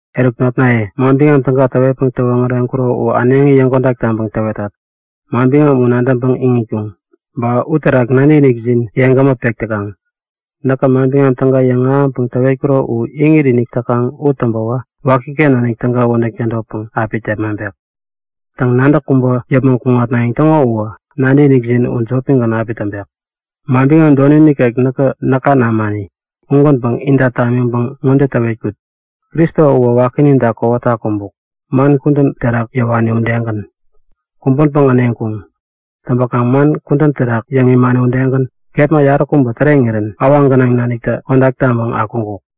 Eruk notnaye, Manbiŋam Täga täwetpäŋ täwoŋäreŋkuro u äneŋi yäŋkodak taŋpäŋ täwetat. Manbiŋam u nadäŋpäŋ iŋitkuŋ, ba uterak nadäkinikjin yeŋgämä pek täkaŋ. Näkä Manbiŋam Täga yäŋahäŋpäŋ täwetkuro u iŋit-inik täkaŋ u täŋpäwä wakiken nanik täga wädäŋ tädotpäŋ api tepmaŋpek. Täŋ, nadäk kubä yäpmäŋ kuŋatnayäŋ täŋo uwä nadäkinikjin u jopigän api täŋpek. Manbiŋam doni nikek näka namani ugänpäŋ inta tamiŋpäŋ ŋode täwetkut; Kristo uwä wakininta kowata kumbuk, man kudän terak yäwani udegän. Kumbänpäŋ äneŋkuŋ. Täŋpäkaŋ man kudän terak yäŋ imani udegän, kepma yaräkubä täreŋirän awaŋ gänaŋ naniktä kodak taŋpäŋ akuŋkuk.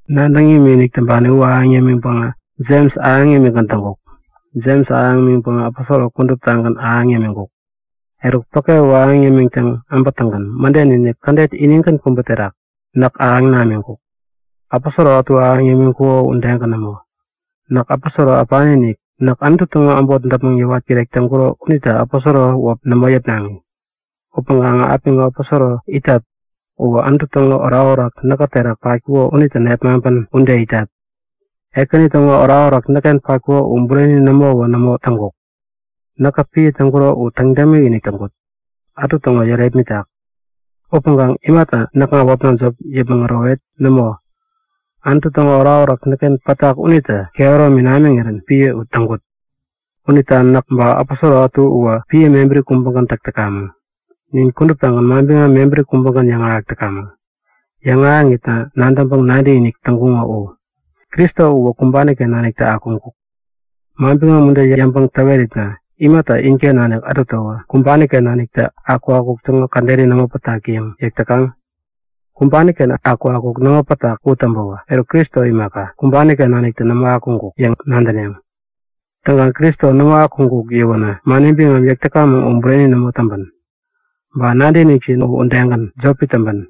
Nadäŋ imikinik täŋpani u ahäŋ yämiŋpäŋä Jems ahäŋ imikgän täŋkuk. Jems ahäŋ imiŋpäŋä aposoro kuduptagän ahäŋ yämiŋkuk. Eruk päke u ahäŋ yämiŋtäŋ äbätäŋgän mäden-inik kädet inigän kubä terak näk ahäŋ namiŋkuk, aposoro ätu ahäŋ yämiŋkuko udegän nämo. Näk aposoro äpanitä äpani-inik. Näk Anutu täŋo äbot däpmäŋ yäwat kirek täŋkuro unita aposoro wäp nämo yäpnaŋi. Upäŋkaŋä apiŋo aposoro it täyat uwä Anutu täŋo orakorak näkä terak patkuko unitä nepmaŋpän ude itat. Ekäni täŋo orakorak näkken patkuko u bureni nämowä nämo täŋkuk. Näkä piä täŋkuro u täŋ dämikinik täŋkut, ätu täŋo yärepmitak. Upäŋkaŋ imata näkŋa wäpna jop yäpmäŋ ärowet? Nämo, Anutu täŋo orakorak näkken pätak unitä kehäromi namiŋirän piä u täŋkut. Unita näk ba aposoro ätu uwä piä mebäri kubägän täk täkamäŋ. Nin kuduptagän manbiŋam mebäri kubägän yäŋahäk täkamäŋ. Yäŋahäŋitna nadäŋpäŋ nadäkinik täŋkuŋo u. Kristo uwä kumbani-ken naniktä akuŋkuk, manbiŋam ude yäŋpäŋ täweritna imata inken nanik ätutäwä kumbani-ken naniktä akukakuk täŋo käderi nämo pätak yäŋ yäk täkaŋ? Kumbani-ken akukakuk nämo pätak u täŋpäwä, eruk Kristo imaka, kumbani-ken naniktä nämo akuŋkuk yäŋ nadäneŋ. Täŋkaŋ Kristo nämo akuŋkuk yäwänä mani biŋam yäk täkamäŋ u bureni nämo täŋpän, ba nadäkinikjin u udegän, jopi täŋpän.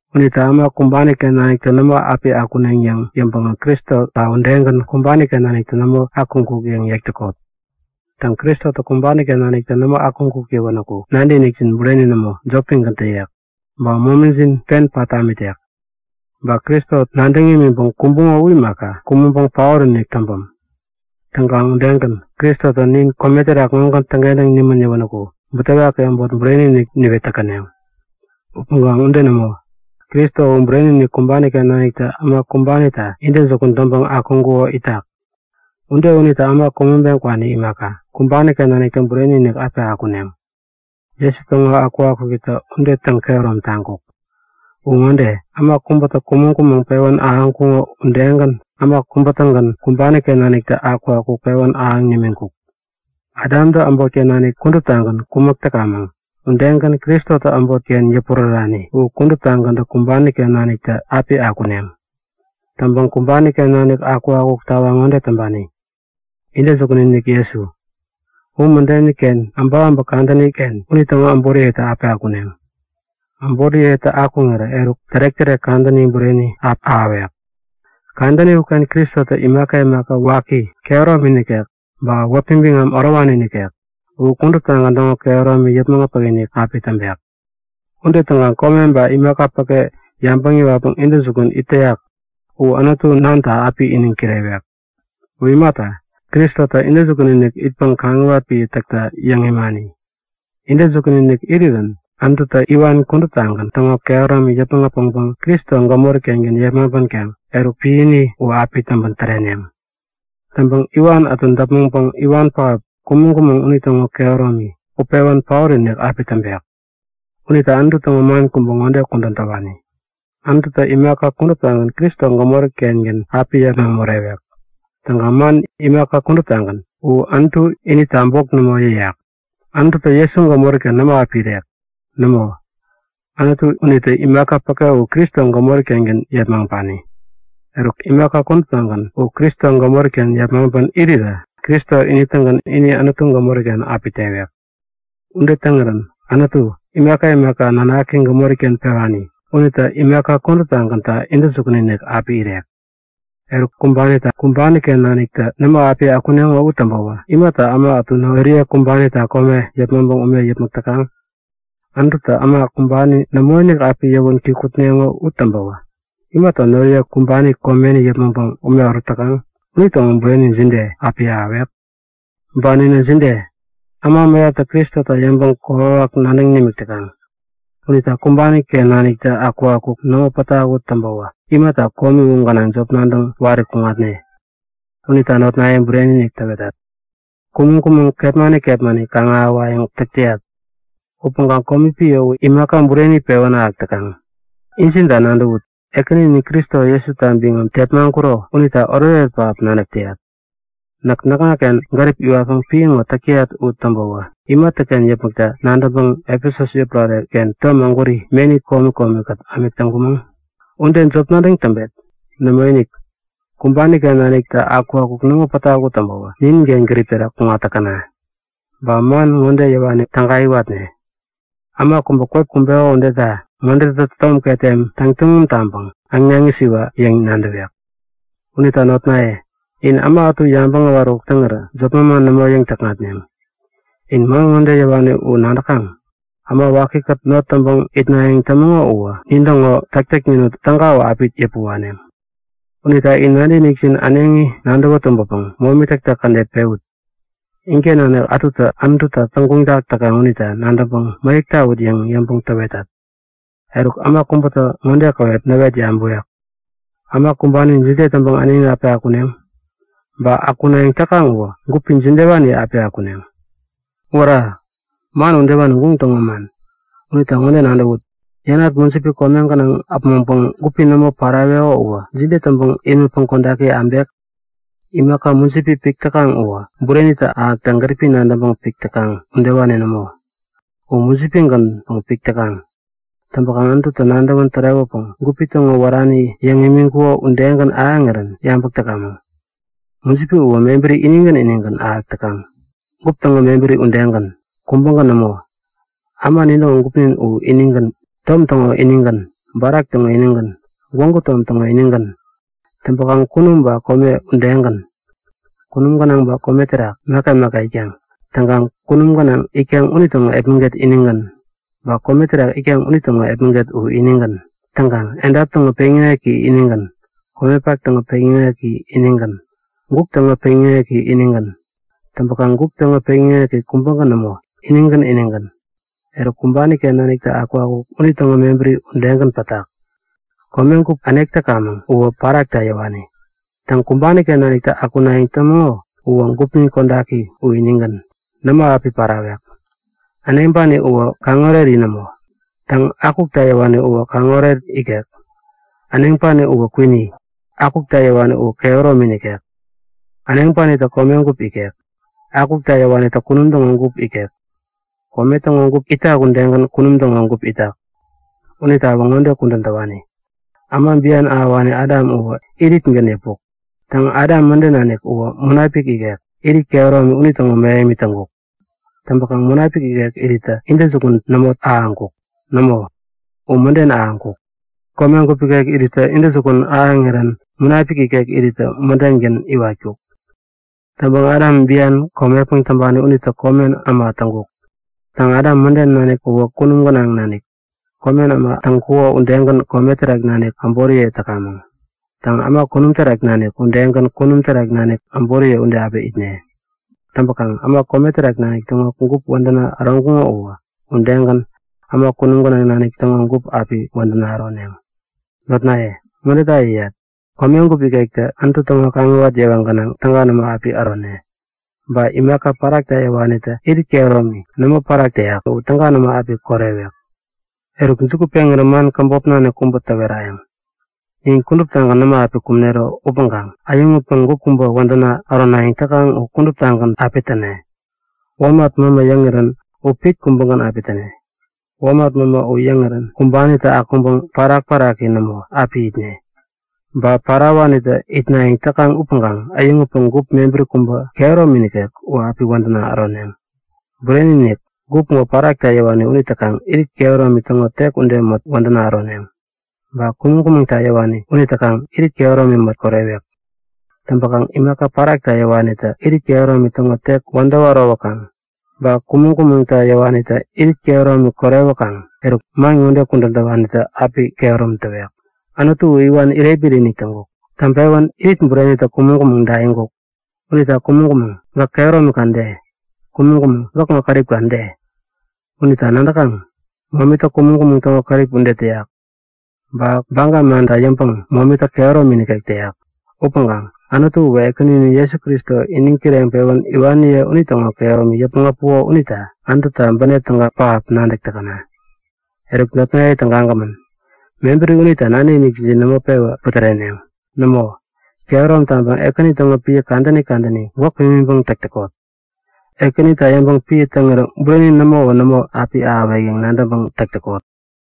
Unita äma kumbani-ken naniktä nämo api akuneŋ yäŋ yäŋpäŋä Kristota udegän kumbani-ken naniktä nämo akuŋkuk yäŋ yäk täkot. Täŋ, Kristotä kumbani-ken naniktä nämo akuŋkuk yäwänäku nadäkinikjin bureni nämo, jopigän täyek. Ba momijin pen pat tamitek. Ba Kristo nadäŋ imiŋpäŋ kumbuŋo u imaka, kumäŋpäŋ paot-inik täŋpäm. Täŋkaŋ udegän, Kristotä nin kome terak ŋogän täŋkentäŋ nimän yäwänäku butewaki äbot bureni-inik yäŋ niwet täkäneŋ. Upäŋkaŋ ude nämo! Kristo u bureni-inik kumbani-ken naniktä äma kumbanita intäjukun täŋpäŋ akuŋkuko itak! Ude unita äma kumäŋpeŋ kwani imaka, kumbani-ken naniktä bureni-inik api akuneŋ. Jesu täŋo akukakukitä ude täŋkehärom taŋkuk. U ŋode; Äma kubätä kumäŋ-kumäŋ pewän ahäŋkuŋo udegän äma kubä-tägän kumbani-ken naniktä akukakuk pewän ahäŋ nimiŋkuk. Adamtä äbotken nanik kuduptagän kumäk täkamäŋ udegän Kristotä äbotken yäpurärärani u kuduptagäntä kumbani-ken naniktä api akuneŋ. Täŋpäŋ kumbani-ken naniktä akukakuk tawaŋ ŋode täŋpani; Intäjukun-inik Jesu. U mädeni-ken äbäkäbäk kadänini-ken unitäŋo äboriyetä api akuneŋ. Äboriyetä akuŋirä eruk tärek-tärek kadäni bureni api ahäwek. Kadäni uken Kristotä imaka imaka waki kehäromi nikek ba wäpi biŋam ärowani nikek u kuduptagän täŋo kehäromi yäpmäŋ äpäkinik api täŋpek. Ude täŋkaŋ kome ba imaka päke yabäŋ yäwatpäŋ intäjukun it täyak u Anutu Nanta api iniŋ kirewek. U imata, Kristotä intäjukun-inik itpäŋ kaŋiwat piä täkta yäŋ imani. Intäjukun-inik irirän Anututä iwan kuduptagän täŋo kehäromi yäpmäŋ äpäŋpäŋ Kristo gämori-ken yepmaŋpänkaŋ eruk, piäni u api täŋpän täreneŋ. Täŋpäŋ iwan ätu däpmäŋpäŋ iwan pähap, kumäŋ-kumäŋ unitäŋo kehäromi utpewän paot-inik api täŋpek. Unita Anutu täŋo man kubä ŋode kudän täwani; Anututä imaka kuduptagän Kristo gämori-kengän api yepmaŋ morewek. Täŋkaŋ man “imaka kuduptagän” uwä Anutu inita bok nämo yäyak. Anututä Jesu gämori-ken nämo api irek. Nämo, Anutu unitä imaka päke u Kristo gämori-kengän yepmaŋpani. Eruk, imaka kuduptagän u Kristo gämori-ken yepmaŋpän irirä, Kristo ini-tägän ini Anutu gämori-ken api tewek. Ude täŋirän Anutu, imaka imaka nanaki gämori-ken pewani unitä imaka kuduptagänta intäjukun-inik api irek. Eruk, kumbanitä kumbani-ken naniktä nämo api akuneŋo u täŋpäwä imata äma ätu noriye kumbanita kome yäpmäŋpäŋ ume yäpmäk täkaŋ? Anututä äma kumbani nämoinik api yäwän kikŋutneŋo u täŋpäwä imata noriye kumbani komeni yäpmäŋpäŋ ume ärut täkaŋ? Unitäŋo bureni jide api ahäwek? Ba ninä jide? Äma mäyaptä Kristota yäŋpäŋ kokwawak nadäŋ nimik täkaŋ. Unita kumbani-ken naniktä akukakuk nämo pätak u täŋpäwä imata komi u gänaŋ jop nadäŋ wari kuŋatne? Unita notnaye, bureni-inik täwetat; Kumäŋ-kumäŋ kepmani kepmani kaŋ-ahäwayäŋ täk täyat. Upäŋkaŋ komi piä u imaka bureni pewän ahäk täkaŋ. Injinta nadäwut; Ekäninin Kristo Jesuta biŋam tepmaŋkuro unita oretoret pähap nadäk täyat. Näk näkŋaken gärip iwatpäŋ piä ŋo täk täyat u täŋpäwä imatäken yäpmäkta nadäŋpäŋ Efesus yotpärare-ken tom ägwäri, meni komi komi-kät ämik täŋkumäŋ? Ude jop nadäŋ täŋpet? Nämoinik, kumbani-ken naniktä akukakuk nämo pätak u täŋpäwä nininken gärip terak kuŋat täkäna! Ba man ŋode yäwani täga iwatne; Äma kubä kwep kumbeko udeta ŋodetä tom ketem täŋ tuŋum taŋpäŋ äŋnaŋ isiwa yäŋ nadäwek. Unita notnaye, in äma ätu yabäŋ äwaräkuk täŋirä jop manman nämo yäŋ-täkŋatneŋ. In man ŋode yäwani u nadäkaŋ? Äma wakikät not täŋpäŋ itnayäŋ tämäŋo uwä nintäŋo täktäknin täga u api yäpä waneŋ. Unita in nadäk-nadäkjin äneŋi nadäwä tumbäpäŋ momi täktäk kädet pewut. Inken nanik ätutä Anututa täŋguŋtak täkaŋ unita nadäŋpäŋ mäyäk tawut yäŋ yäŋpäŋ täwetat. Eruk äma kubätä ŋode käwep näwet yabäwek; Äma kumbani jide täŋpäŋ äneŋi api akuneŋ? Ba akunayäŋ täkaŋ uwä gupi jidewanitä api akuneŋ? Wära! Man udewani guŋ täŋo man! Unita ŋode nadäwut; Yänat mujipi kome gänaŋ äpmoŋpäŋ gupi nämo paraweko uwä jide täŋpäŋ imätpäŋ kodaki abek? Imaka mujipi pik täkaŋ uwä burenitä ahäkta gäripi nadäŋpäŋ pik täkaŋ udewani nämo. U mujipi-gänpäŋ pik täkaŋ. Täŋpäkaŋ Anututä nadäwän tärewäpäŋ gupi täŋo wärani yäŋ imiŋkuko udegän ahäŋirän yabäk täkamäŋ. Mujipi uwä mebäri inigän inigän ahäk täkaŋ. Gup täŋo mebäri udegän, kubägän nämo. Äma nintäŋo gupnin u inigän. Tom täŋo inigän, barak täŋo inigän, gwägu tom täŋo inigän. Täŋpäkaŋ kunum ba kome udegän. Kunum gänaŋ ba kome terak imaka imaka itkaŋ. Täŋkaŋ kunum gänaŋ itkaŋ unitäŋo epmäget inigän. Ba kome terak itkaŋ unitäŋo epmäget u inigän. Täŋkaŋ edap täŋo peŋyäŋeki inigän. Komepak täŋo peŋyäŋeki inigän. Guk täŋo peŋyäŋeki inigän. Täŋpäkaŋ guk täŋo peŋyäŋeki kubägän nämo, inigän inigän. Eruk, kumbani-ken naniktä akukakuk unitäŋo mebäri udegän pätak. Komegup änek täkamäŋ uwä parakta yäwani. Täŋ, kumbani-ken nanik akunayäŋ tämäŋo uwä gupnin kodaki u inigän, nämo api parawek. Äneŋpani uwä kaŋoreri nämo. Täŋ, akukta yäwani uwä kaŋoret ikek. Äneŋpani uwä kwini, akukta yäwani uwä kehäromi nikek. Äneŋpanitä komegup ikek, akukta yäwanitä kunum täŋo gup ikek. Kome täŋo gup itak udegän kunum täŋo gup itak. Unitawä ŋode kudän täwani; Äma bian ahäwani Adam uwä iritgän yäpuk. Täŋ, Adam mäden nanik uwä Munapik ikek irit kehäromi unitäŋo mähemi täŋkuk. Täŋpäkaŋ Munapik ikek irittä intäjukun nämo ahäŋkuk. Nämo, u mäden ahäŋkuk. Komegup ikek irittä intäjukun ahäŋirän Munapik ikek mädengän iwatkuk. Täŋpäŋ Adam biani komepäŋ täŋpani unita komen äma täŋkuk. Täŋ, Adam mäden nanik uwä kunum gänaŋ nanik. Komen äma täŋkuko udegän kome terak nanik äboriye täkamäŋ. Täŋ, äma kunum terak nanik udegän kunum terak nanik äboriye ude api itne. Täŋpäkaŋ äma kome terak nanik täŋo gup wädäna äroŋkuŋo uwä, udegän äma kunum gänaŋ nanik täŋo gup api wädäna äroneŋ. Notnaye, ŋodeta yäyat; Komegup ikektä Anutu täŋo kaŋiwat yewa gänaŋ täga nämo api ärone. Ba imaka parakta yäwanitä irit kehäromi, nämo parak täyak u täga nämo api korewek. Eruk, juku peŋirä man käbop nanik kubä täwerayäŋ; Nin kuduptagän nämo api kumnero upäŋkaŋ äyäŋutpäŋ gup kubä wädäna äronayäŋ täkaŋ u kuduptagän api täne. Womat mämä yäŋirän u pit kubägän api täne. Womat mämä u yäŋirän kumbanitä akuŋpäŋ parak-paraki nämo api itne. Ba parawanitä itnayäŋ täkaŋ upäŋkaŋ äyäŋutpäŋ gup mebäri kubä kehäromi nikek u api wädäna äroneŋ. Bureni-inik! Gup ŋo parakta yäwani unitäkaŋ irit kehäromi täŋo tek ude mät wädäna äroneŋ. Ba kumäŋ-kumäŋta yäwani unitäkaŋ irit kehäromi mät korewek. Täŋpäkaŋ imaka parakta yäwanitä irit kehäromi täŋo tek wädäwä ärowäkaŋ, ba kumäŋ-kumäŋta yäwanitä irit kehäromi korewäkaŋ eruk man ŋode kudän täwanitä api kehärom täwek; Anutu u iwan irepmit-inik täŋkuk. Täŋpewän irit burenitä kumäŋ-kumäŋ daiŋkuk! Unita kumäŋ-kumäŋ, gäk kehäromika de? Kumäŋ-kumäŋ gäkŋo käripka de? Unita nadäkaŋ? Momitä kumäŋ-kumäŋ täŋo kärip ude täyak. Ba baga manta yäŋpäŋ momitä kehäromi nikek täyak. Upäŋkaŋ Anutu uwä Ekäninin Jesu Kristo iniŋ kireŋpewän iwaniye unitäŋo kehäromi yäpmäŋ äpuko unita Anututa bänep täga pähap nadäk täkäna! Eruk notnaye tägagämän, mebäri unita nadäkinikjin nämo pewä putäreneŋ. Nämo, kehärom taŋpäŋ Ekäni täŋo piä kadäni kadäni gwäk pimiŋpäŋ täk täkot. Ekänita yäŋpäŋ piä täŋirä bureni nämowä nämo api ahäwek yäŋ nadäŋpäŋ täk täkot.